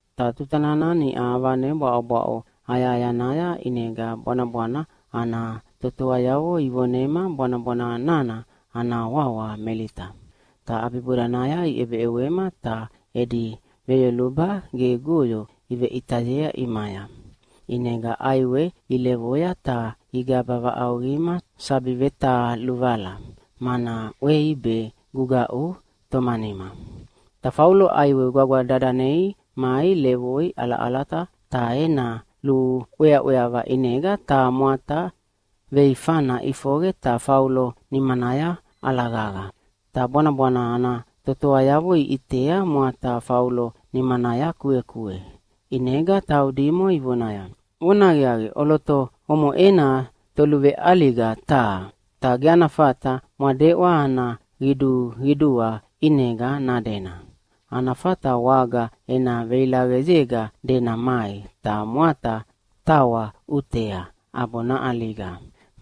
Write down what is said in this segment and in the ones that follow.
Ta tuta nana niʼa avane bwaʼobwaʼo ayahayanaya ʼinega bwanabwana ana totoayavo ivonema bwanabwana nana ana wawa Melita. Ta ʼabibodanaya iʼebeʼewema ta edi veyoluba gegoyo iveʼitayea ʼimaya. ʼInega ʼaiwe ilevoya ta igaba vaʼauqima sabi vetaluvala, mana ʼwei be gugaʼu tomanima. Ta Faulo ʼaiwe gwagwa dadanei mai levoi ʼalaʼalata, ta ena luʼweaʼweava ʼinega taha mwata veifana ʼifoqe ta Faulo nimanaya ʼalaqaqa. Ta bwanabwana ana totoayavo iʼitea mwata Faulo nimanaya kuekue. ʼInega taudimo ivonaya, “Vonahaqiaqi, ʼoloto omoʼena toluveʼaliga taha. Ta ge ana fata mwadeʼwa ana qiduqidua ʼinega nadena. Ana fata waga ena veilaqeyega dena mai, ta mwata tawa ʼutea ʼabo naʼaliga,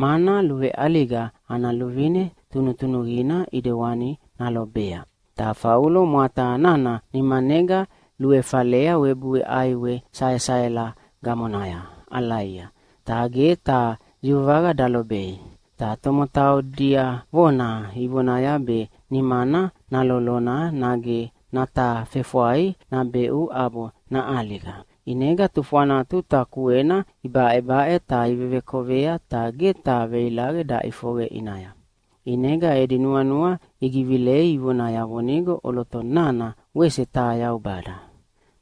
mana luveʼaliga ana luvine tunutunuqina ʼidewani nalobea.” Ta Faulo mwata nana nimanega luefalea webui ʼaiwe saesaela gamonaya ʼalaia, ta ge taha yuvaqa dalobei. Ta tomotau diavona ivonaya be nimana nalolona nage natafefwai nabeʼu ʼabo naʼaliga. ʼInega tufwana tuta kuena ibaʼebaʼe ta ivevekovea, ta ge taha veilaqe daʼifoqe ʼinaya. ʼInega edi nuanua igivilei ivonaya vonigo ʼoloto nana wese taha yaubada.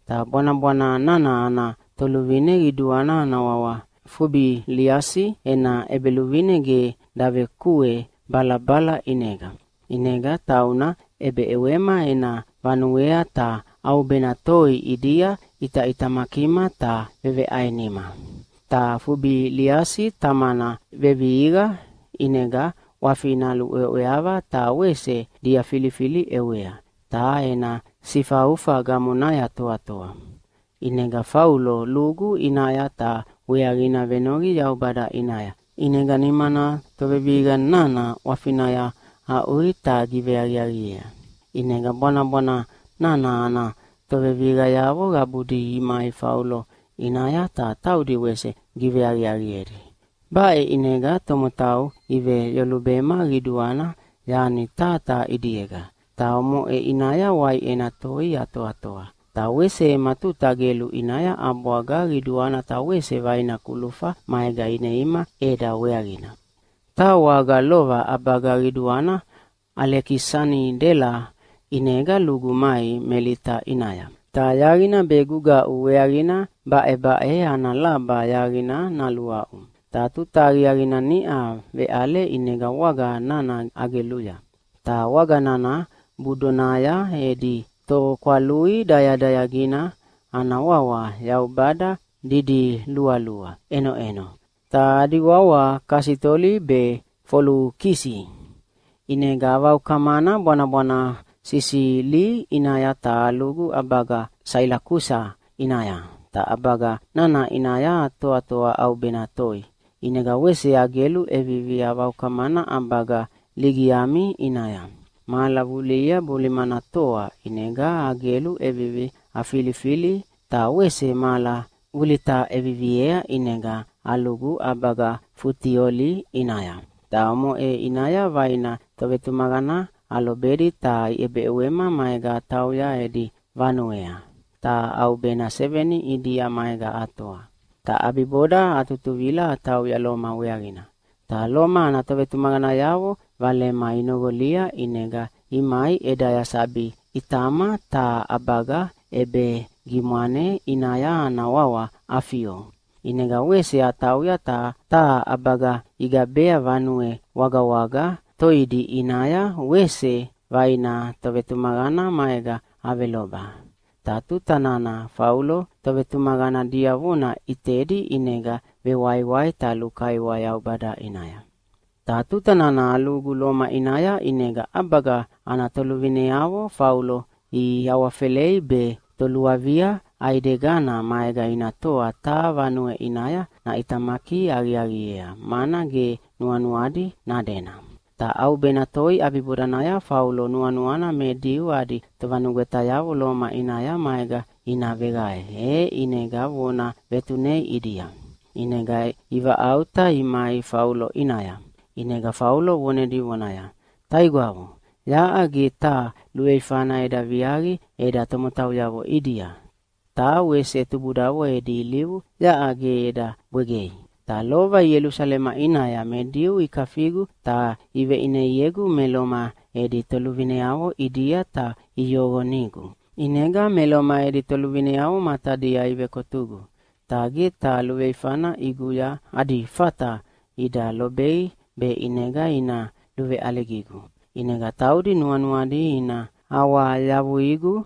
Ta bwanabwana nana ana toluvine qiduana ana wawa Fubiliasi ena ʼebeluvine ge davekue balabala ʼinega. ʼInega tauna ʼebeʼewema ena vanuea ta ʼaubena toi ʼidia ʼitaʼitamakima ta veveʼainima. Ta Fubiliasi tamana vevihiqa ʼinega ʼwafina luʼweaʼweava ta wese diafilifili ʼewea, ta ena sifaufa gamonaya toatoa. ʼInega Faulo lugu ʼinaya ta weaqina venoqi Yaubada ʼinaya, ʼinega nimana tovevihiqa nana ʼwafinaya aʼui ta giveaqiaqiea. ʼInega bwanabwana nana ana tovevihiqayavo qabudi imai Faulo ʼinaya, ta taudi wese giveaqiaqiedi. Baʼe ʼinega tomotau iveyolubema qiduana yani taha taha ʼidiega. Ta omoʼe ʼinaya waiʼena toi atoatoa. Ta wese ema tuta gelu ʼinaya ʼabwaga qiduana ta wese vaina kulufa maega ineima ʼeda weaqina. Taha waga lova ʼabaga qiduana Alekisanidela ʼinega lugu mai Melita ʼinaya, ta yaqina be gugaʼu weaqina baʼebaʼe ana laba yaqina naluaʼu. Ta tuta aqiaqina niʼa veʼale ʼinega waga nana ageluya. Ta waga nana budonaya edi tokwalui dayadayagina ana wawa yaubada didilualua ʼenoʼeno, ta adi wawa Kasitoli be Folukisi. ʼInega avaukamana bwanabwana Sisili ʼinaya ta alugu ʼabaga Sailakusa ʼinaya, ta ʼabaga nana ʼinaya atoatoa ʼaubena toi. ʼInega wese agelu ʼevivi avaukamana ʼabaga Ligiami ʼinaya. Mahala vulihia bolimana toa, ʼinega agelu ʼevivi afilifili, ta wese mahala vulita ʼeviviea ʼinega alugu ʼabaga Futioli ʼinaya. Ta omoʼe ʼinaya vaina tovetumaqana alobedi ta iʼebeʼewema maega atauya edi vanuea, ta ʼaubena seveni ʼidia maega atoa. Ta ʼabiboda atutuvila atauya Loma weaqina. Ta Loma ana tovetumaqanayavo valema inoqolia, ʼinega imai ʼedaya sabi ʼitama taha ʼabaga ʼebegimwane ʼinaya ana wawa Afio. ʼInega wese atauya ta taha ʼabaga igabea Vanue Wagawaga Toidi ʼinaya wese vaina tovetumaqana maega aveloba. Ta tuta nana Faulo tovetumaqana diavona ʼitedi ʼinega vewaiwai ta lukaiwa Yaubada ʼinaya. Ta tuta nana alugu Loma ʼinaya, ʼinega ʼabaga ana toluvineavo Faulo iawafelei be toluavia ʼaidegana maega ina toa taha vanue ʼinaya naʼitamaki aqiaqiea, mana ge nuanuadi nadena. Ta ʼaubena toi ʼabibodanaya Faulo nuanuana me Diu adi tovanugwetayavo Loma ʼinaya maega ina veqae, e ʼinega vona vetunea ʼidia. ʼInega ivaʼauta imai Faulo ʼinaya. ʼInega Faulo vonedi vonaya, “Taigwavo, yaʼa ge taha luveifana eda viaqi eda tomotauyavo ʼidia, ta wese tubudavo edi ilivu yaʼa ge eda bwegei. Ta lova Ielusalema ʼinaya me Diu ikafigu ta iveʼineiegu me Loma edi toluvineavo ʼidia ta iyoqonigu. ʼInega me Loma edi toluvineavo matadia ivekotugu, ta ge taha luveifana ʼiguya adi fata ida lobei be ʼinega ina luveʼaligigu. ʼInega taudi nuanuadi ina awayavuigu.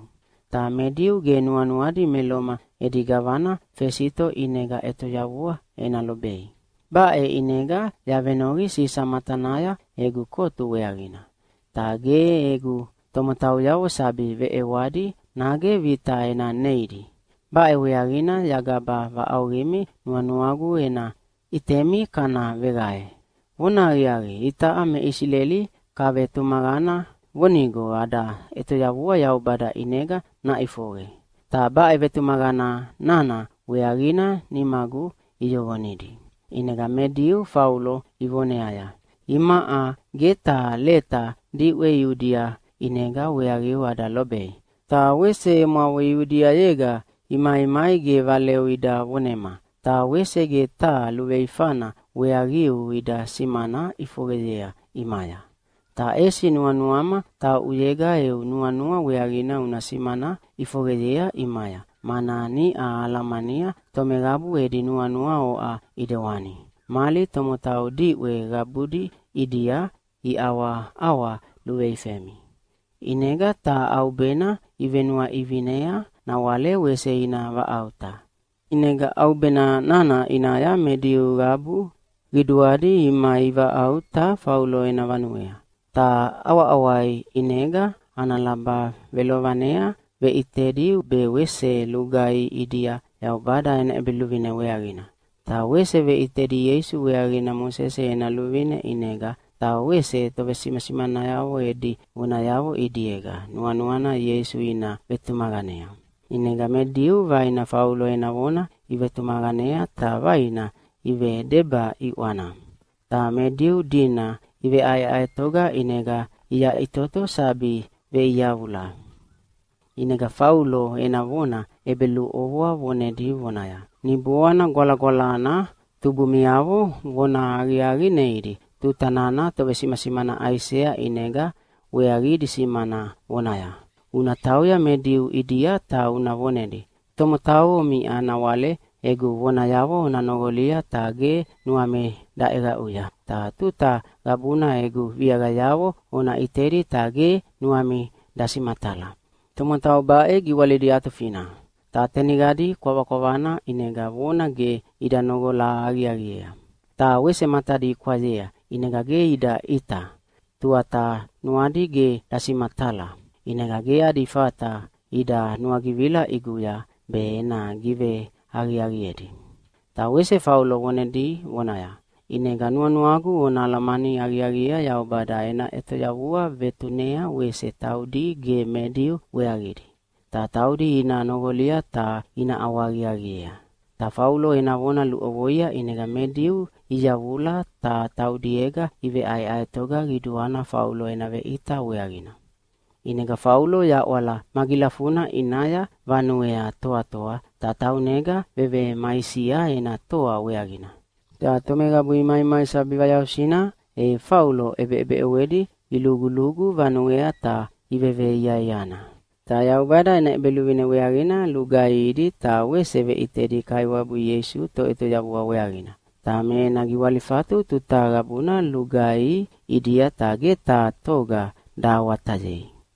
Ta me Diu ge nuanuadi me Loma edi gavana Fesito ʼinega ʼetoyavua ena lobei. Baʼe ʼinega yavenoqi Sisa matanaya egu kotu weaqina. Ta ge egu tomotauyavo sabi veʼewadi nage vita ena neidi. Baʼe weaqina yagaba vaʼauqimi nuanuagu ena ʼitemi kana veqae. Vonahaqiaqi, itaʼa me Isileli kavetumaqana vonigo ada ʼetoyavua Yaubada ʼinega naʼifoqe. Ta baʼe vetumaqana nana weaqina nimagu iyoqonidi.” ʼInega me Diu Faulo ivoneaya, “Imaʼa ge taha leta diʼwe Iudia ʼinega weaqiu ada lobei. Ta wese emwavo Iudiayega imaimai ge valeu ida vonema, ta wese ge taha luveifana weaqiu ida simana ʼifoqeyea ʼimaya. Ta ʼesi nuanuama tauʼuyega eu nuanua weaqina una simana ʼifoqeyea ʼimaya, mana niʼa ahalamania tomeqabu edi nuanua oʼa ʼidewani, mali tomotau diʼwe qabudi ʼidia iʼawaʼawa luveifemi.” ʼInega taha ʼaubena ivenuaʼivinea nawale wese ina vaʼauta. ʼInega ʼaubena nana ʼinaya me Diu qabu qiduadi imai ivaʼauta Faulo ena vanuea. Ta ʼawaʼawai ʼinega ana laba velovanea veʼitedi be wese lugaihi ʼidia Yaubada ena ʼEbeluvine weaqina. Ta wese veʼitedi Ieisu weaqina Mosese ena luvine ʼinega, ta wese tovesimasimanayavo edi vonayavo ʼidiega, nuanuana Ieisu ina vetumaqanea. ʼInega me Diu vaina Faulo ena vona ivetumaqanea ta vaina ivedeba ʼiʼwana. Ta me Diu dina iveʼaeʼaetoga ʼinega iyaʼitoto sabi veʼiyavula. ʼInega Faulo ena vona ʼebeluʼovoa vonedi vonaya, “Niboana Gwalagwalana tubumiavo vonahaqiaqi neidi tuta nana tovesimasimana Aisea ʼinega weaqidi simana vonaya, ‘Una tauya me Diu ʼidia ta una vonedi, Tomotau omiʼa nawale egu vonayavo ona noqolia ta ge nuami daʼeqaʼuya, ta tuta qabuna egu viaqayavo ona ʼitedi ta ge nuami dasimatala. Tomotau baʼe giwalidi atufina. Ta teniqadi kwavana ʼinega vona ge ida noqola aqiaqiea. Ta wese matadi ikwayea, ʼinega ge ida ʼita, tuata nuadi ge dasimatala. ʼInega ge adi fata ida nuagivila ʼiguya be ena giveaqiaqiedi.’” Ta wese Faulo vonedi vonaya, “ʼInega nuanuagu ona alamani aqiaqiea Yaubada ena ʼetoyavua vetunea wese taudi ge me Diu weaqidi. Ta taudi ina noqolia ta ina ʼawahaqiaqiea.” Ta Faulo ena vona luʼovoia ʼinega me Diu iyavula ta taudiega iveʼaeʼaetoga qiduana Faulo ena veʼita weaqina. ʼInega Faulo yaʼwala magilafuna ʼinaya vanuea toatoa, ta taunega vevemaisia ena toa weaqina. Ta tomeqabu imaimai sabi vayausina, e Faulo ʼebeʼebeʼewedi ilugulugu vanuea ta iveveiaiana. Ta Yaubada ena ʼEbeluvine weaqina lugaihidi ta wese veʼitedi Kaiwabu Ieisu Toʼetoyavua weaqina. Ta me ena giwalifatu tuta qabuna lugaihi ʼidia, ta ge taha toga dahawatayei.